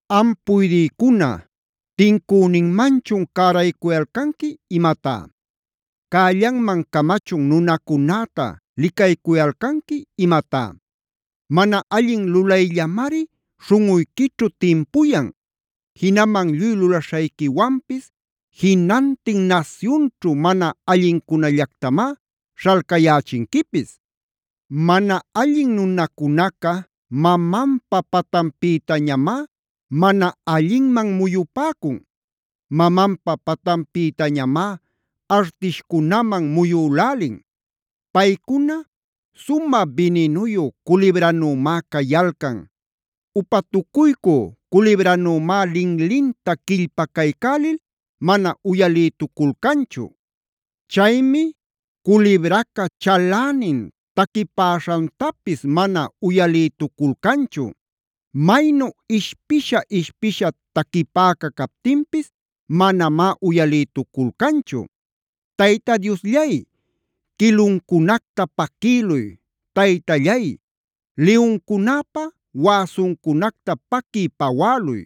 Am puydïcuna, ¿tincüninmanchun cäraycuyalcanqui imatá? ¿Cällanman camachun nunacunäta licaycuyalcanqui imatá? Mana allin lulayllamari śhunꞌuyquićhu timpuyan. Jinaman lluy lulaśhayquiwanpis jinantin nasyunćhu mana allincunallactamá śhalcayächinquipis. Mana allin nunacunaca mamanpa patanpïtañamá mana allinman muyupäcun. Mamanpa patanpïtañamá artishcunaman muyülälin. Paycuna sumä bininuyu culibranümá cayalcan. Upatucuycü culibranümá linlinta quillpacaycälil mana uyalïtuculcanchu. Chaymi culibraca chalänin taquipäśhantapis mana uyalïtuculcanchu. Maynu ishpisha-ishpisha taquipäca captinpis manamá uyalïtuculcanchu. Tayta Diosllay, ¡quiluncunacta paquïluy! Taytallay, ¡liyuncunäpa wäsuncunacta paquiy-pawäluy!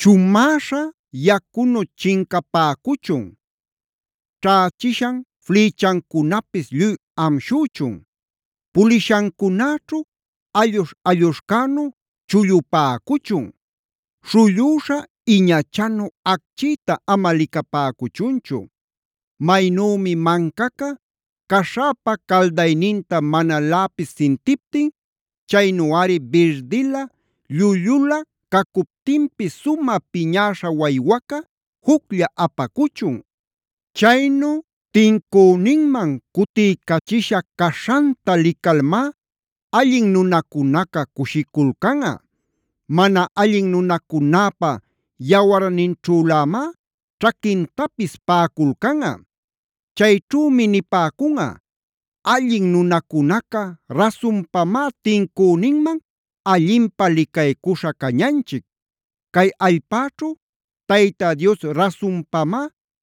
Chumäśha yacunu chincapäcuchun. Ćhächishan flïchancunapis lluy amshüchun. Pulishancunäćhu alluśh-alluśhcänu chullupäcuchun. Śhullüśha iñachanu acchïta ama licapäcuchunchu. Maynümi mancaca caśhäpa caldayninta manaläpis sintiptin, chaynuꞌari birdilä llullulä cacuptinpis sumä piñäśha waywaca juclla apacuchun. Chaynu tincüninman cutiycachisha caśhanta licalmá allin nunacunaca cushiculcanꞌa. ¡Mana allin nunacunäpa yawarninćhülämá ćhaquintapis paꞌaculcanꞌa! Chayćhümi nipäcunꞌa: “Allin nunacunaca rasunpamá tincüninman allinpä licaycuśha cañanchic. Cay allpäćhu Tayta Dios rasunpamá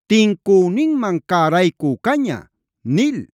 tincüninman cäraycü caña” nil.